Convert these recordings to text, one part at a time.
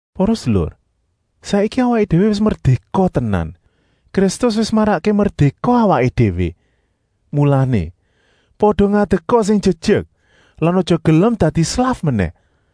Para sedulur, saiki awaké déwé wis merdéka tenan, Kristus wis marakké merdéka awaké déwé. Mulané, pada ngadeka sing jejek lan aja gelem dadi slaf menèh.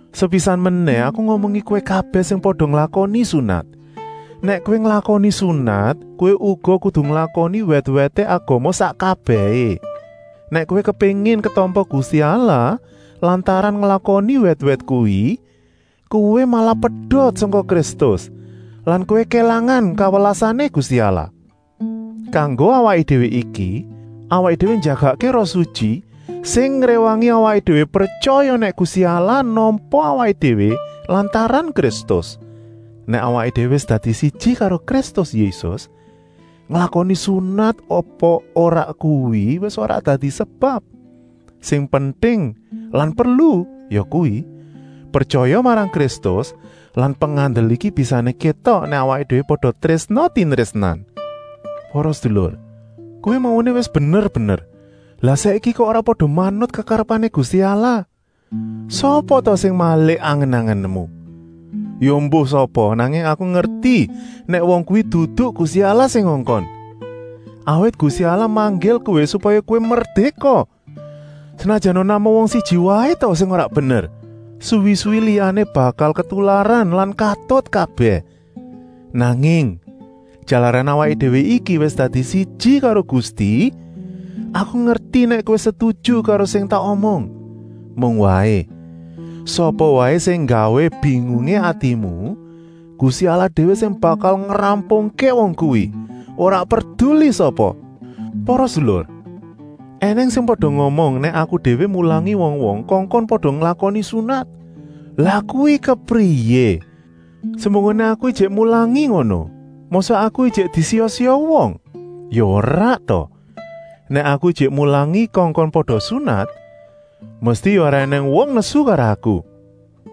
Sepisan menèh aku ngomongi kowé kabèh sing pada nglakoni sunat: nèk kowé nglakoni sunat, kowé uga kudu nglakoni wèt-wèté agama sak kabèhé. Nèk kowé kepéngin ketampa Gusti Allah lantaran nglakoni wèt-wèt kuwi, kowé malah pedot sangka Kristus lan kowé kélangan kawelasané Gusti Allah. Kanggo awaké déwé iki, awaké déwé njagakké Roh Sutyi sing ngréwangi awaké déwé pretyaya nèk Gusti Allah nampa awaké déwé lantaran Kristus. Nèk awaké déwé wis dadi siji karo Kristus Yésus, nglakoni sunat apa ora kuwi wis ora dadi sebab. Sing penting lan perlu yakuwi: pretyaya marang Kristus lan pengandel iki bisané kétok nèk awaké déwé pada trésna-tinrésnan. Para sedulur! Kowé mauné wis bener-bener, lah saiki kok ora pada manut kekarepané Gusti Allah? Sapa ta sing malik angen-angenmu? Ya embuh sapa, nanging aku ngerti nèk wong kuwi dudu Gusti Allah sing ngongkon. Awit Gusti Allah manggil kowé supaya kowé merdéka. Senajana namung wong siji waé ta sing ora bener, suwi-suwi liya-liyané bakal ketularan lan katut kabèh. Nanging, jalaran awaké déwé iki wis dadi siji karo Gusti, aku ngerti nèk kowé setuju karo sing tak omong. Mung waé, sapa waé sing nggawé bingungé atimu, Gusti Allah déwé sing bakal ngrampungké wong kuwi. Ora perduli sapa! Para sedulur, ènèng sing pada ngomong nèk aku déwé mulangi wong-wong kongkon pada nglakoni sunat. Lah kuwi kepriyé! Semunggoné aku ijik mulangi ngono, mosok aku ijik disiya-siya wong? Ya ora ta? Nèk aku ijik mulangi kongkon pada sunat, mesti ya ora ènèng wong nesu karo aku,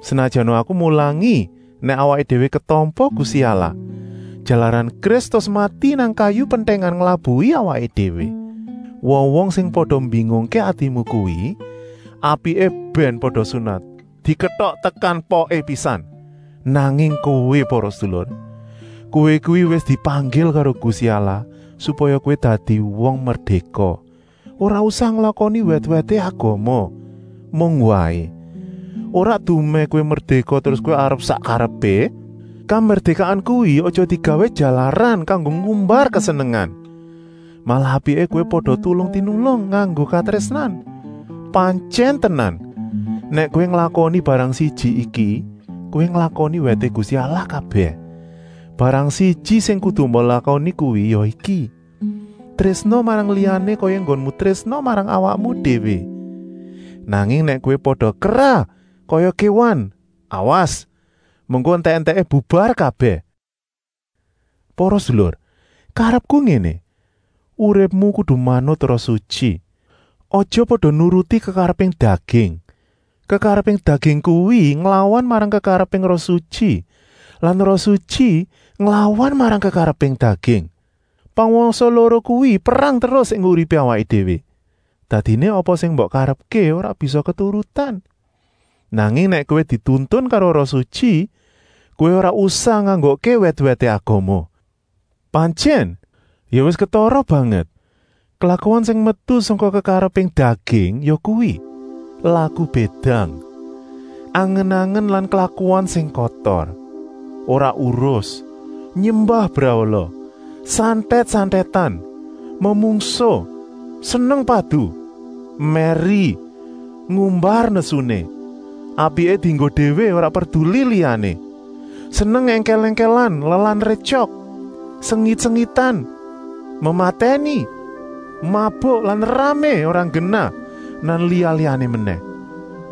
senajana aku mulangi nèk awaké déwé ketampa Gusti Allah, jalaran Kristus mati nang kayu pentèngan nglabuhi awaké déwé. Wong-wong sing pada mbingungké atimu kuwi, apiké bèn pada sunat diketok tekan poké pisan. Nanging kowé, para sedulur, kowé kuwi wis dipanggil karo Gusti Allah supaya kowé dadi wong merdéka, ora usah nglakoni wèt-wèté agama. Mung waé, ora dumèh kowé merdéka terus kowé arep sak karepé. Kamerdékaan kuwi aja digawé jalaran kanggo ngumbar kesenengan. Malah apiké kowé pada tulung-tinulung nganggo katrésnan. Pantyèn tenan, nèk kowé nglakoni barang siji iki, kowé nglakoni wèté Gusti Allah kabèh. Barang siji sing kudu mbok lakoni kuwi ya iki: Trésna marang liyané kaya enggonmu trésna marang awakmu déwé. Nanging nèk kowé pada kerah kaya kéwan, awas, mengko entèk-entèké bubar kabèh. Para sedulur, karepku ngéné: uripmu kudu manut Roh Sutyi. Aja pada nuruti kekareping daging. Kekareping daging kuwi nglawan marang kekareping Roh Sutyi lan Roh Sutyi nglawan marang kekareping daging. Pangwasa loro kuwi perang terus ing uripé awaké déwé. Dadiné apa sing mbok karepké ora bisa keturutan. Nanging nèk kowé dituntun karo Roh Sutyi, kowé ora usah nganggokké wèt-wèté agama. Pantyèn ya wis ketara banget klakuan sing metu sangka kekareping daging, yakuwi: Laku bédang, angen-angen lan klakuan sing kotor, ora urus, nyembah brahala, santèt-santètan, memungsuh, seneng padu, mèri, ngumbar nesuné, apiké dienggo déwé ora perduli liyané, seneng èngkèl-èngkèlan lan rétyok, sengit-sengitan, mematèni, mabuk lan ramé ora nggenah lan liya-liyané menèh.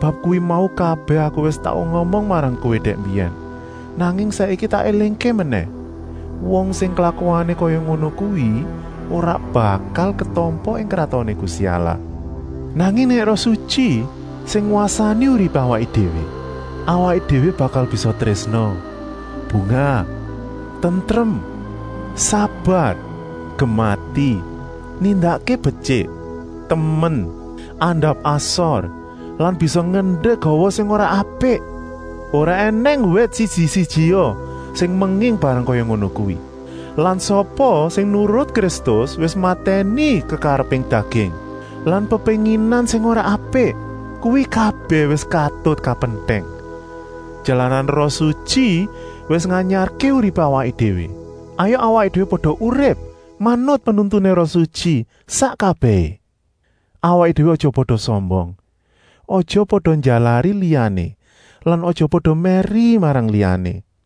Bab kuwi mau kabèh aku wis tau ngomong marang kowé dèk mbiyèn, nanging saiki tak élingké menèh: wong sing klakuané kaya ngono kuwi ora bakal ditampa ing Kratoné Gusti Allah. Nanging nèk Roh Sutyi sing ngwasani uripé awaké déwé, awaké déwé bakal bisa trésna, bungah, tentrem, sabar, gemati, nindakké betyik, temen, andap-asor lan bisa ngendek hawa sing ora apik. Ora ènèng wèt siji-sijia sing menging barang kaya ngono kuwi. Lan sapa sing nurut Kristus wis matèni kekareping daging lan pepénginan sing ora apik, kuwi kabèh wis katut kapentèng. Jalaran Roh Sutyi wis nganyarké uripé awaké déwé, hayuk awaké déwé pada urip manut penuntuné Roh Sutyi sak kabèhé. Awaké déwé aja pada sombong, aja pada njalari liyané lan aja pada mèri marang liyané.